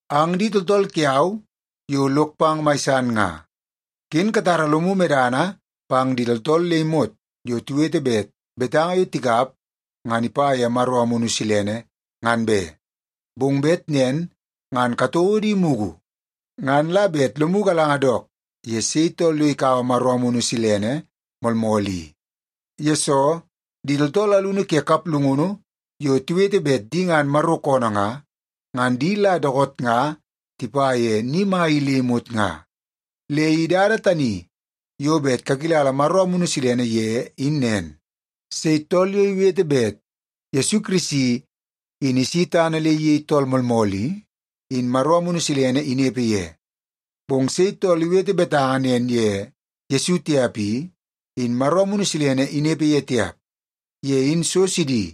Ang di tooltool kiau yo lok pang mai san nga, ken katara lomu medana pang di tooltool le imot yo tiwete bet betanga yo tikap ngan ipa ye Maro Amunu Silene, ngan be. Bong bet nen ngan katouo di mugu, ngan la bet lomu galanga dook ye sei tool yo ikaua Maro Amunu Silene moolmool i. Yesoo, di tooltool alunu ke kaplungunu yo tiwete bet di ngan Maro koonoo nga, ngan di la dookoot nga tipa ye ni mai i le imot nga. Le i dada tani yo bet kakilala Maro Amunu Silene ye in nen; sei tool yo iwete bet Yesu Kirisi in isi tana le iyei tool moolmool i, in Maro Amunu Silene inepe ye. Bong sei tool iwete betanga nen ye Yesu tiap i, in Maro Amunu Silene inepe ye tiap. Ye in so sidi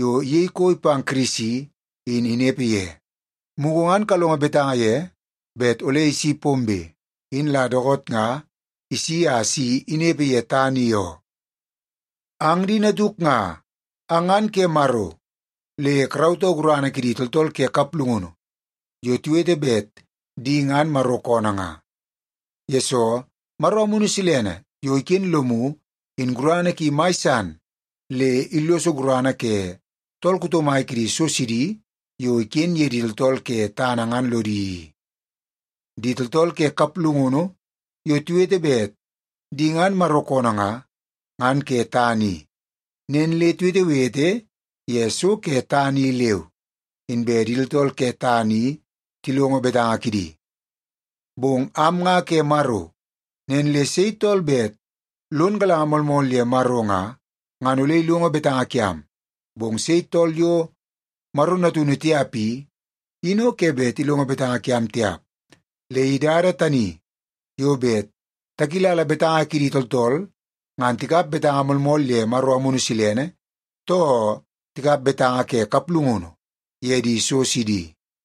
yo iyei koi pang Kirisi in inepe ye. Mugu ngan kalongo betanga ye bet ole isi pombe, in la dookoot nga isi a si inepe ye tana i oo. Ang di natuk nga, ang ngan ke Maro le karautoo gurana kidi tooltool ke kaplungunu yo tiwete bet di ngan Maro koonoo nga. Yesoo, Maro Amunu Silene yo iken lomu in gurana ki mai san le illoso gurana ke tool kuto mai kidi so sidi yo iken ye di tooltool ke tana ngan lodi i. Di tooltool ke kaplungunu yo tiwete bet di ngan Maro koonoo nga, ngan ke tana i. Nen le tiwetewete ye so ke tana i leu, inbe di tooltool ke tana i tilongo betanga kidi. Bong am nga ke Maro. Nen le sei tool bet lon galanga moolmool ye Maro nga, ngan ole ilongo betanga kiam. Bong sei tool yo Maro natunu tiap i, in o ke bet ilongo betanga kiam tiap. Le i dada tani yo bet takilala betanga kidi tooltool ngan tikap betanga moolmool ye Maro Amunu Silene, too tikap betanga ke kaplungunu ye di so sidi.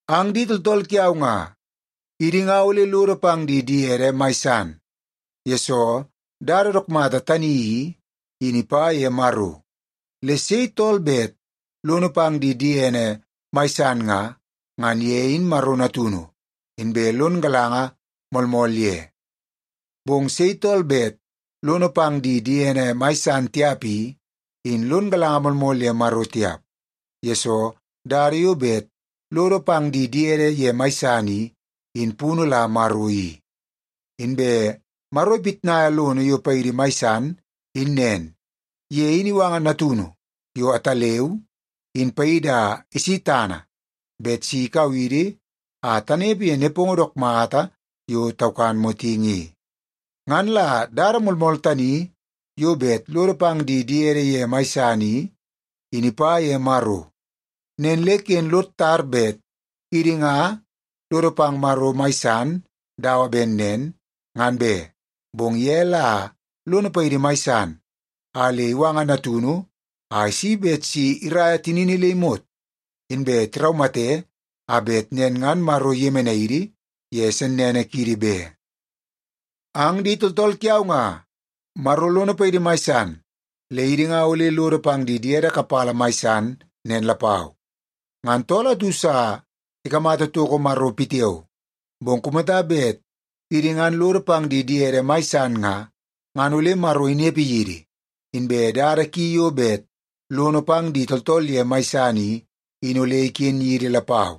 Ang di tooltool kiau nga, idi nga ole lodo pang di diede mai san, yesoo dada dook mata tani i, in ipa ye Maro. Le sei tool bet lono pang di diene mai san nga, ngan ye in Maro natunu, inbe lon galanga moolmool ye. Bong sei tool bet lono pang di diene mai san tiap i, in lon galanga moolmool ye Maro tiap, yesoo dada yo bet lodo pang di diede ye mai san i, in punu la Maro i. Inbe Maro ipitnaia lono yo paidi mai san in nen: Ye in iwanga Natunu yo ataleu, in paidi a isi tana bet si ikau idi a tanepe ye nepongo dook mata yo taukan motingi i. Ngan la dada moolmool tani yo bet lodo pang di diede ye mai san i, in ipa ye Maro. Nen le ken lod tar bet idi nga lodo pang Maro mai san dawa ben nen, ngan be, bong ye la lono paidi mai san a le iwanga Natunu a isi bet si iraia tinini le imot inbe tiraumate a bet nen ngan Maro iyemenai idi ye sennene kiidi be. Ang di tooltool kiau nga, Maro lono paidi mai san le idi nga ole lodo pang di diede kapala mai san nen lapau. Ngan tool atu sa ikamata toko Maro pitiao, bong kumata bet idi ngan lodo pang di diede mai san nga, ngan ole Maro inepe yidi, inbe dada ki yo bet lono pang di tooltool ye mai san i, in ole iken yidi lapau.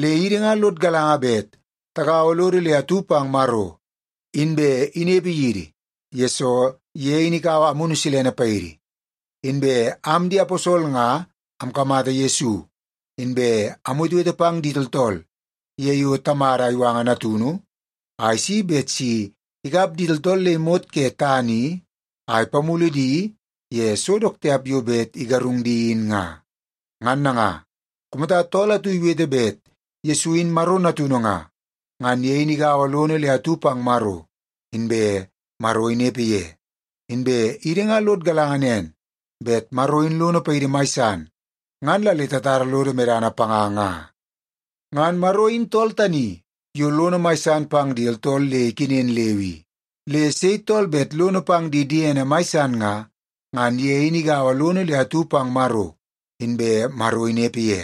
Le idi nga lod galanga bet tagaua lodo le atu pang Maro, inbe inepe yidi, yesoo ye in ikaua Amunu Silene paidi. Inbe am di aposol nga amkamata Yesu, inbe amwetewete pang di tooltool ye yo Tamada iwanga Natunu a isi bet si ikap di tooltool le imot ke tana i a ipamulu di ye so dook tiap yo bet igarung di in nga. Ngan nanga, kumata tool atu iwete bet Yesu in Maro Natunu nga, ngan ye in igaua lono le atu pang Maro, inbe Maro inepe ye. Inbe idi nga lod galanga nen bet Maro in lono paidi mai san ngan la le tatara lodo medana panga nga. Ngan Maro in tool tani yo lono mai san pang di tooltool le ikenen leu i. Le sei tool bet lono pang di diene mai san nga, ngan ye in igaua lono le atu pang Maro, inbe Maro inepe ye.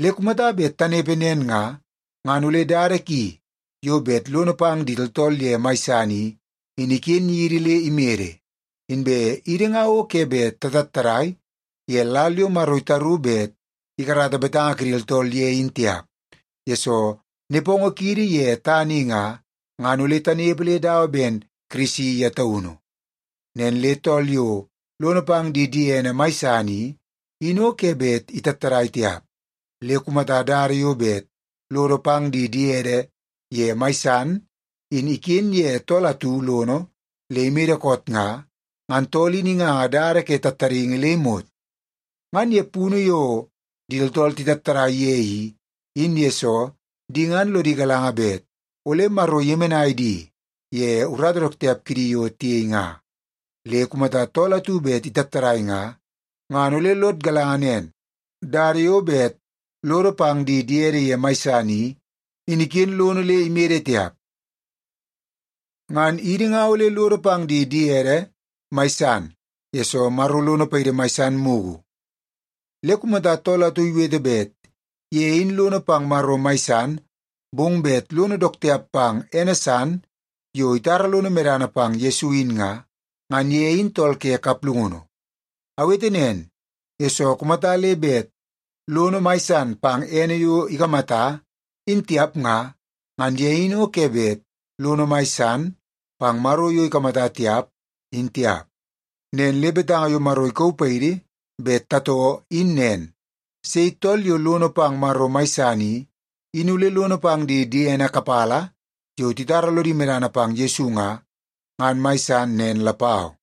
Le kumata bet tanepe nen nga, ngan ole dada ki yo bet lono pang di tooltool ye mai san i, in iken yidi le imede. Inbe idi nga o ke bet tatattadai ye lal yo Maro itaru bet ikarata betanga kidi tooltool ye in tiap, yesoo nepongo kiidi ye tana i nga, ngan ole tanepe le dawa ben Kirisi ye taunu. Nen le tool yo lono pang di diene mai san i, in o ke bet itattadai tiap. Le kumata dada yo bet lodo pang di diede ye mai san in iken ye tool atu lono le imede koot nga, ngan tool in inganga dada ke tattadaingi le imot. Ngan ye punu yo di tooltool titattadai ye i, in yesoo di ngan lodi galanga bet ole Maro iyemenai di ye urata dook tiap kidi yo tiyei nga. Le kumata tool atu bet itattadai nga, ngan ole lod galanga nen, dada yo bet lodo pang di diede ye mai san i, in iken lono le imede tiap. Ngan idi nga ole lodo pang di diede mai san, yesoo Maro lono paidi mai san mugu. Le kumata tool atu iwete bet ye in lono pang Maro mai san, bong bet lono dook tiap pang ene san yo itara lono medana pang Yesu in nga, ngan ye in tool ke kaplungunu. Awete nen, yesoo kumata le bet lono mai san pang ene yo ikamata, in tiap nga, ngan ye in o ke bet lono mai san pang Maro yo ikamata tiap, in tiap. Nen le betanga yo Maro ikauu paidi bet tatoo in nen: Sei tool yo lono pang Maro mai san i, in ole lono pang di diene kapala yo titara lodi medana pang Yesu nga, ngan mai san nen lapau.